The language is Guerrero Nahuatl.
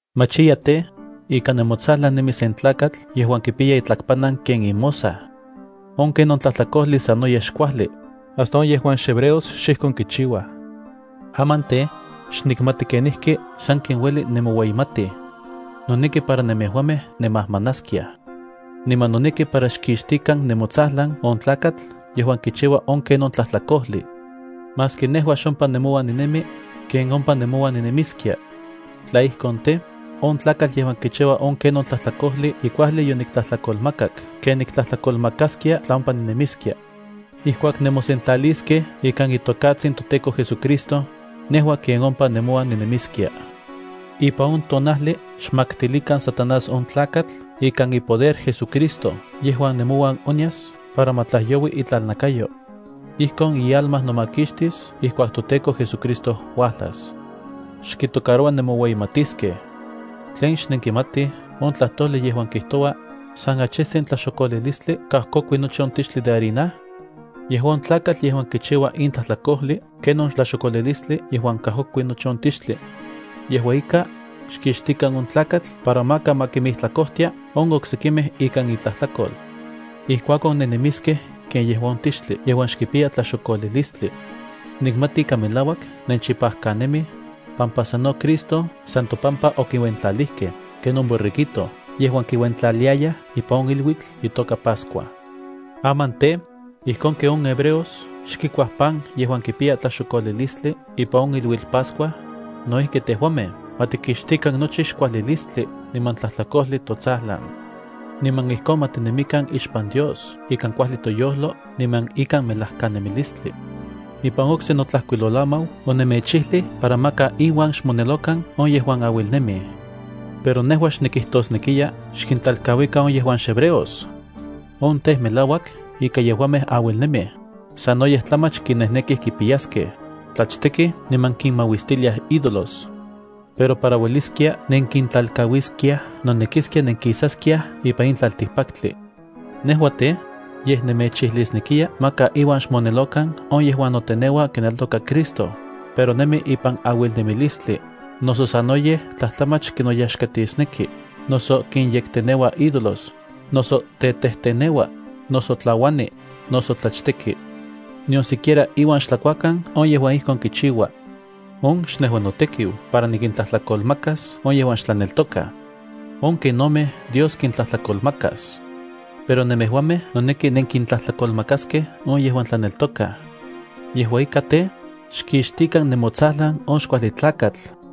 Machiya tej, ika nemotsajlan nemi sen tlakatl yejuan kipiya itlakpanan ken imosaj. On ken on tlajtlakojli sanoyej xkuajli hasta on yejuan xhebreos xijkon kichiuaj. Aman tej, xnikmati kenijki sanken ueli nemoueyimatij. Noneki para nemejuamej nemajmanaskiaj. Niman noneki para xkixtikan nemotsajlan on tlakatl yejuan kichiua on ken on tlajtlakojli. Maski nejua xompa nemouan ninemi, ken ompa nemouan ninemiskia. Tla ijkon tej, on tlakatl yejuan kichiua on ken on tlajtlakojli ye kuajli yoniktlajtlakolmakak ken niktlajtlakolmakaskia tla ompa ninemiskia. Ijkuak nemosentlaliskej ikan itokatsin toTEKO JesuCristo, nejua ken ompa nemouan ninemiskia. Ipan on tonajli xmaktilikan Satanás on tlakatl ikan ipoder JesuCristo yejuan nemouan onyas para ma tlajyoui itlalnakayo. Ijkon ialma nomakixtis ijkuak toTEKO JesuCristo uajlas. Xkitocaroua nemoueyimatiskej. ¿Tlen xnenkimatij on tlajtojli yejuan kijtoua: “San achijtsin tlaxokolilistli kajkokui nochi on tixtli de harina”? Yejua on tlakatl yejuan kichiua in tlajtlakojli ken on tlaxokolilistli yejuan kajkokui nochi on tixtli. Yejua ika, xkixtikan on tlakatl para maka ma kimijtlakojtia on oksekimej ikan itlajtlakol. Ijkuakon nennemiskej ken yejua on tixtli yejuan xkipiya tlaxokolilistli. Nikmati ika melauak nenchipajkanemij, pampa sano Cristo san topampa okiuentlalijkej ken on borreguito yejuan kiuentlaliayaj ipan on iluitl itoka Pascua. Aman tej, ijkon ken on hebreos xkikuaj pan yejua kipiya tlaxokolilistli ipan on iluitl Pascua, no ijki tejuamej ma tikixtikan nochi xkuajlilistli niman tlajtlakojli totsajlan. Niman ijkon ma tinemikan ixpan Dios ikan kuajli toyojlo niman ikan melajkanemilistli. Ipan okse notlajkuilolamau onemechijlij para maka inuan xmonelokan on yejuan auilnemij. Pero nejua xnikijtosnekiya xkintlalkauikan on yejuan xhebreos. On tej, melauak ika yejuamej auilnemij, sanoyej tlamach kinejnekij kipiyaskej, tlachtekij niman kinmauistiliaj ídolos. Pero para ueliskia nenkintlalkauiskiaj nonekiskia nenkisaskiaj ipan in tlaltikpaktli. Nejua tej, yej nemechijlisnekiya maka iuan xmonelokan on yejuan noteneua kineltoka Cristo, pero nemi ipan auilnemilistli, noso sanoyej tlajtlamach kinoyaxkatisneki, noso kinyekteneua ídolos, noso tetejteneua, noso tlauani, noso tlachteki. Nion siquiera iuan xtlakuakan on yejuan ijkon kichiua. On xnejua notekiu para nikintlajtlakolmakas on yejuan xtlaneltokaj. On kenomej Dios kintlajtlakolmakas. Pero nemejuamej noneki nenkintlajtlakolmakaskej on yejuan tlaneltokaj. Yejua ika tej, xkixtikan nemotsajlan on xkuajli tlakatl.